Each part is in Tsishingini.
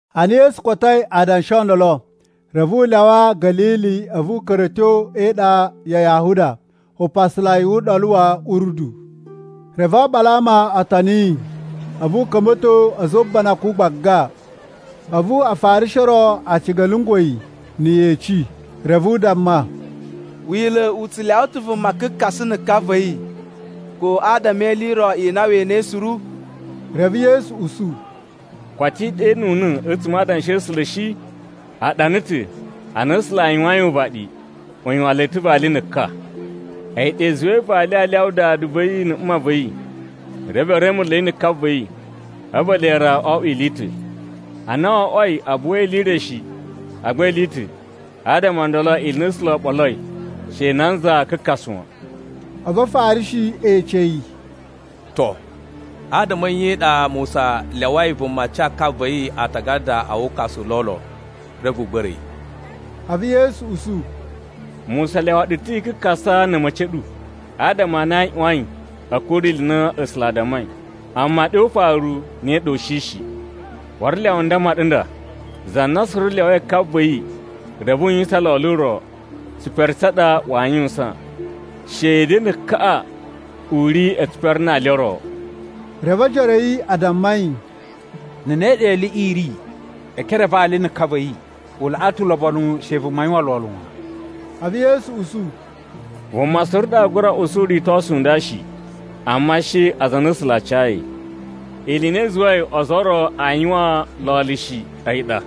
Ana Yesu kotoi adanshi o ndolo, reve u lyawa Ga̱lili a̱vu u ka̱ra̱ a̱ tyo e iɗa ya Yahuda upasalai wu Uɗolu wa̱ Urdu. Reve oɓolo a ama o toni yi, a̱vu u ka̱mba̱to a̱za̱ o ubanakun gbaga. A̱vu Afarishi o ro a ciga a lyungwa̱ yi na̱ yeci, reve a damma, “Wila̱ u tsu u lyawa ta̱ vuma kakasa na̱ ka va̱ yi ko adama e ili i ro i na we enei suru?” Reve Yesu usu, “Koto i ɗenuna̱ a̱tsuma̱ a Adanshi a̱ A̱sula̱ shi? A ɗana ta̱ ana A̱sula̱ a yuwain uvaɗi, ‘U yuwan le ta̱ vali na̱ ka. A̱yi ɗa i zuwai vali aa lyawa dada va̱ yi na̱ mma va̱ yi reve e remulei na̱ ka va̱ yi, a̱vu ele ra o oꞌwo ili i ta̱.’ Ana wo oꞌwoi a buwa ili i re shi, agba ili i ta̱, adama o ndolo ili i na A̱sula̱ o ɓoloi she nanza kakasa wan.” A̱vu Afarishi e ece yi, “To, adama a̱ nye i ɗa Musa lyawai vuma ca ka va̱ yi aatagada a wukasu u lolo reve u gba̱ra̱ yi?” A̱vu Yesu usu, “Musa lyawa ɗu ta̱ i kakasa na̱ a̱ma̱ci a̱ ɗu, adama a na i ꞌyuwain a̱ kuru ili i na A̱sula̱ a dammai, amma ɗe o ufaru ne ɗa u shi shi. Waru lyawa n damma ɗu nda, za na suru lyawai ka va̱ yi reve u yuwisan lolo ro, tsipere tsa ɗa waa yuwusan, shede na̱ kaꞌa u ri e tsipere na ali o ro.” Reve ojoro a̱ yi a damma yi, “Na̱ ne ɗa iliꞌi i ri e ekere a vali na̱ ka va̱ yi, u laꞌa ta̱ ulobonu she vuma yuwan lolo wan.” A̱vu Yesu usu, “Vuma suru ɗa aa gura usu uritosu u nda shi, amma she aza a na A̱sula̱ a cayi. Ili i na i zuwai ozo o ro aa yuwan lolo shi a̱yi ɗa,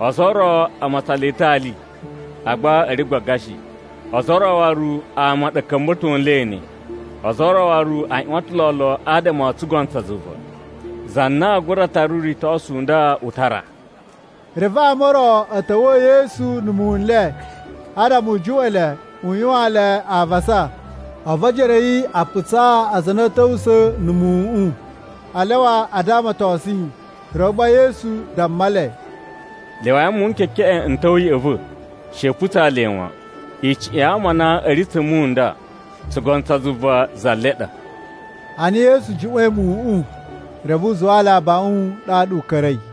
ozo o ro a matsan le ta̱ ali agba a̱ ri gbaga shi. Ozo o ro waru ama a ɗa a̱ ka̱mba̱to nle ne. Ozo o ro waru a ꞌyuwan ta̱ lolo adama o tsugono tsa zuva. Za na aa gura tara uritosu u nda u tara.” Reve ama o ro a̱ ta̱wa̱a̱ Yesu na̱ muwun n le, adama u juꞌwa̱n le u yuwaan le avasa. A̱vu ojoro a̱ yi a putsaa aza a na a̱ ta̱wusa̱a̱ na̱ muwuꞌun, a lyawa a damatosun yi. Reve gba Yesu damma le, “Lyawai muwun n kekeꞌen n ta̱wa̱ ya̱ꞌa̱ va̱, she i putsaa le wan. Icuꞌun ya ama a na a̱ ri tsa̱ muwun n nda, tsugono tsa zuva za le ɗa.” Ana Yesu juꞌwa̱in muwuꞌun, reve u zuwaa le abaꞌun ɗaɗa u ka̱ra̱i.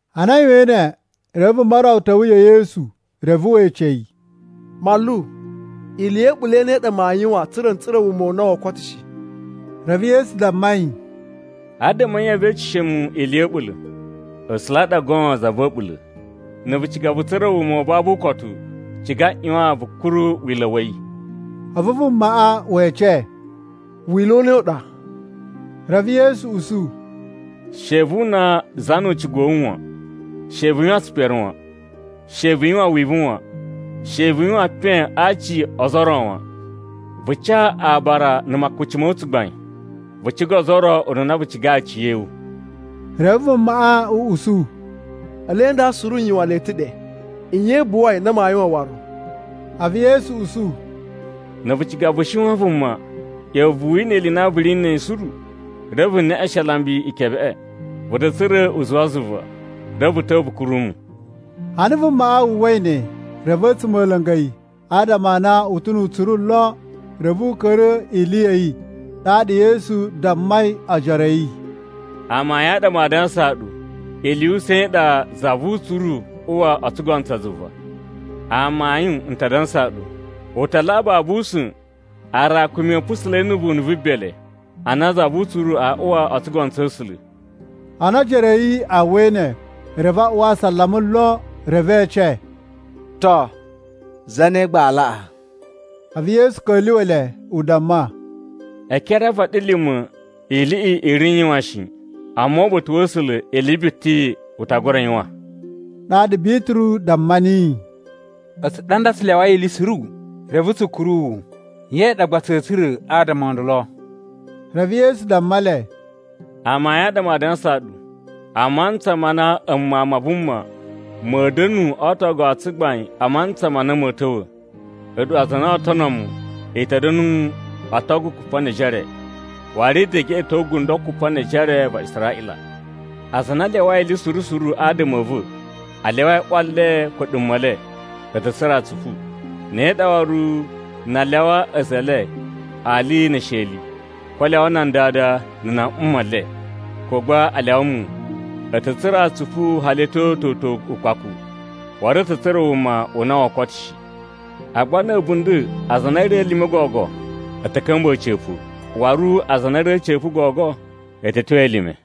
Ana a yuwain ne, reve vuma ro ta̱wa̱ ya̱ Yesu reve we ece yi, “Manlu, ili ya̱ a̱ɓula̱ i ne i ɗa maa yuwan tsa̱ra̱ n tsura̱ wuma u na woo koto shi?” Reve Yesu damma yi, “Adama a̱ nye vee eceshe mu ili ya̱ a̱ɓula̱? A̱sula̱ ɗa goon za va̱ a̱ɓula̱. Na̱ vu ciga vu tsura̱ wuma u babu ukotu, ciga ꞌyuwan vu kuru Wila̱ wa̱ yi.” A̱vu vumaꞌa we ece, “Wila̱ u ne u ɗa?” Reve Yesu usu, “She vu una za nu ucigu wa̱ wu wan. She vu yuwan tsipere wan. She vu yuwan wivu wan. She vu yuwan epen a aci o ozo ro wan. Vu ca aabara na̱ makuci ma̱ wu tsugbain. Vu ciga ozo o ro ununa vu cigai aciya̱wu.” Reve vumaꞌa u usu, “Ele nda suru n yuwan le ta̱ ɗe. Nye i buwai na maa yuwan waru?” A̱vu Yesu usu, “Na̱ vu ciga vu shiwan vuma, ꞌya̱wa̱ vu wina ili i na vu ri na̱ a̱yi suru, reve vu neꞌeshen alambi ikebeꞌe, vu ta̱ tsura̱ uzuwa zuva. Reve vu ta̱wa̱ vu kuru mu.” Ana vumaꞌa wu uwwai ne reve a̱tsuma̱ a̱ la̱nga̱ yi, adama a na u ta̱ nu utsuru lon. Reve u ka̱ra̱ ili ya̱ yi. Ɗaɗa Yesu dammai ojoro a̱ yi, “Amayun a ɗa maa dansaa ɗu, ili yu usa̱n i ɗa za vu utsuru uwa o tsugono tsa zuva. Amayun n ta dansaa ɗu, u ta laꞌa babu usa̱n aarakumi a̱ pusula̱i na̱ vunu vu bele, a na za vu utsuru aa uwa o tsugono tsa̱ A̱sula̱.” Ana ojoro a̱ yi a uwwai ne, reve a uwa asalama lon, reve e ece, “To, zane gba aa laꞌa?” A̱vu Yesu ka̱lyuwa̱ le u damma, “E ekere a vaɗilima̱ iliꞌi i ri n yuwan shi, amma uba̱ta̱ wa̱ A̱sula̱ ili biti u ta gura yuwan.” Ɗaɗa Bituru damma niyi, “A̱tsu ɗa nda tsu lyawai ili suru, reve tsu kuru wu. Nye ɗa gba tsa̱a̱ tsura̱ adama o ndolo?” Reve Yesu damma le, “Amayun a ɗa maa dansaa ɗu, a mantsa ma na a̱mu Mawun ma Vuma, ma̱a̱ da̱nu o ootogu o tsugbain a mantsa ma na ma̱a̱ ta̱wa̱, a̱ɗu aza a na oo tono mu i ta̱ da̱nu o otogu kupa ne ejere, waru i ta̱ geꞌeto gundo kupa ne ejere va Israꞌila. Aza a na a lyawai ili suru suru adama a̱ va̱, a lyawai ꞌwa le ko a̱ɗuma̱ e le, a̱ ta̱ tsura̱ atsupu. Ne ɗa waru na a lyawa a̱za̱ e le ali ne esheli, ko a lyawa nan dada na̱ nan mma le, ko gba a lyawa muwun, a̱ ta̱ tsura̱ atsupu hali a̱ tyo toto ukpaku, waru a̱ ta̱ tsura̱ wuma u na woo koto shi. Agba na̱ a̱bunda̱ aza a na a̱ ri elime gogo a̱ ta̱ ka̱mba̱ a̱ca̱pa̱, waru aza a na a̱ ri a̱ca̱pa̱ gogo a̱ ta̱ tyo elime.”